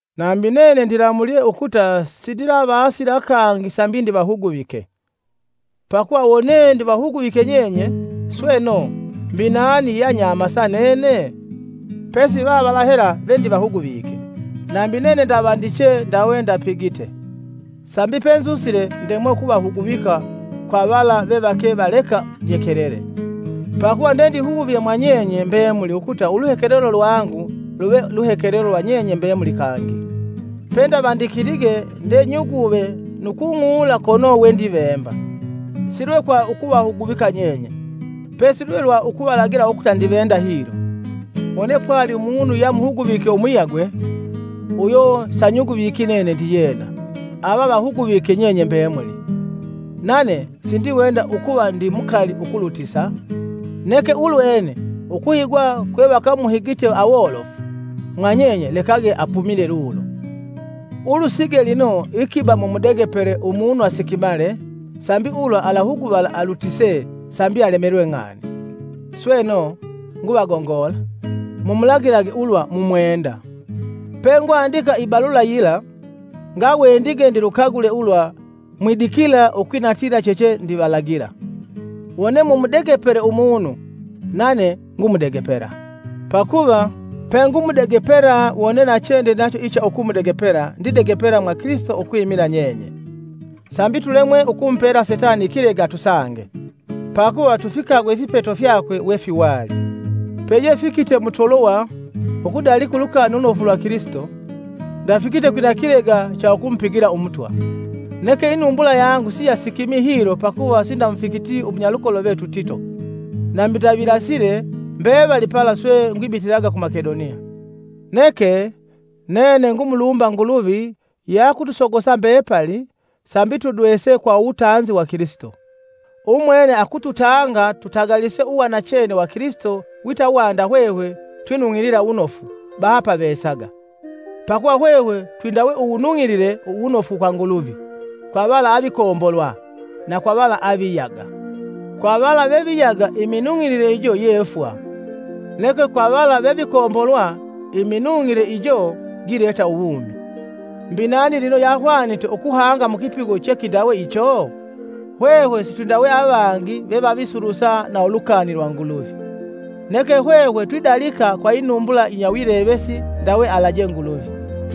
Nambi nene ndilamulye ukuta sindilavasila kangi sambi ndivahuguvike. Pakuva wone ndivahuguvike nyenye, sweno, mbi nani yeanyamasa nene? Pesi vavala hela ve ndivahuguvike! Nambi nene ndavandiche ndawe ndapigite, sambi penzusile ndemwe ukuhuguvala kwa vala vevake valeka nyekelele, pakuva ndendihuvye mwa nyenye mbemuli ukuta uluhekelelo lwangu luve luhekelelo lwa nyenye mbemuli kangi. Pendevandikilige nde nyuguve nu kung'ula kono we ndivemba, si lwe kwa ukuvahuguvika nyenye, pesi lwe lwa ukuvalagila ukuta ndivenda hilo. Wone pwali umunu yamuhuguvike umuyagwe, uyo sanyuguviki nene ndiyena, ava avahuguvike nyenye mbemuli, nane sindiwenda ukuva ndi mukali ukulutisa. Neke ulwene ukuhigwa kwe vakamuhigite awolofu mwa nyenye lekage apumile lulo. Ulusige lino ikiba mumudegepele umunu sikimika sambi ulwa alahuguvala alutise sambi alemelwe ng'ani. Sweno, nguvagongola: mumulagilage ulwa mumwenda. Pengwandika ibalula yila ngawendige ndilukagule ulwa mwidikila ukwinatila chechendivalagila. Wone mumudegepele umunu, nane ngumudegepela. Pakuva pengumudegepela wone nachene ndinacho ulwa ngumudegepela mwa ndidegepela mwa Kilisito ukwimila nyenye, Sambi tulemwe ukumupela Setani ikilega atusange; pakuva tufikagwe ifipeto fyakwe wefiwali. Peyefikite mu Tolowa ukudalika Ulukani Ulunofu lwa Kilisito, ndafikite kwina kilega cha ukumupigila Umutwa. Neke inumbula yangu siyasikimi hilo pakuva sindamufikiti umunyalukolo vetu Tito. Nambi ndavilasile mbevali pala swe ngwibitilaga ku Makedoniya. Neke, nene ngumulumba Nguluvi yakutusogosa mbepali sambi tudwese kwa uwutanzi wa Kilisito. Umwene akututanga tutagalise uwa nachene wa Kilisito wita wanda hwehwe twinung'ilila wunofu, baha pavesaga. Pakuva hwehwe twindawe uwunung'ilile wunofu kwa Nguluvi, kwa vala avikombolwa na kwa vala aviyaga. Kwa vala veviyaga iminung'ilile ijo ye fwa; neke kwa vala vevikombolwa, iminung'ile uyo gileta uwumi. Mbi nani lino yahwanite ukuhanga mu kipigo che kindawe icho? Hwehwe sitwindawe avangi vevavisulusa na ulukani lwa Nguluvi; neke hwehwe twidalika kwa inumbula yinya wilevesi ndawe alaje Nguluvi,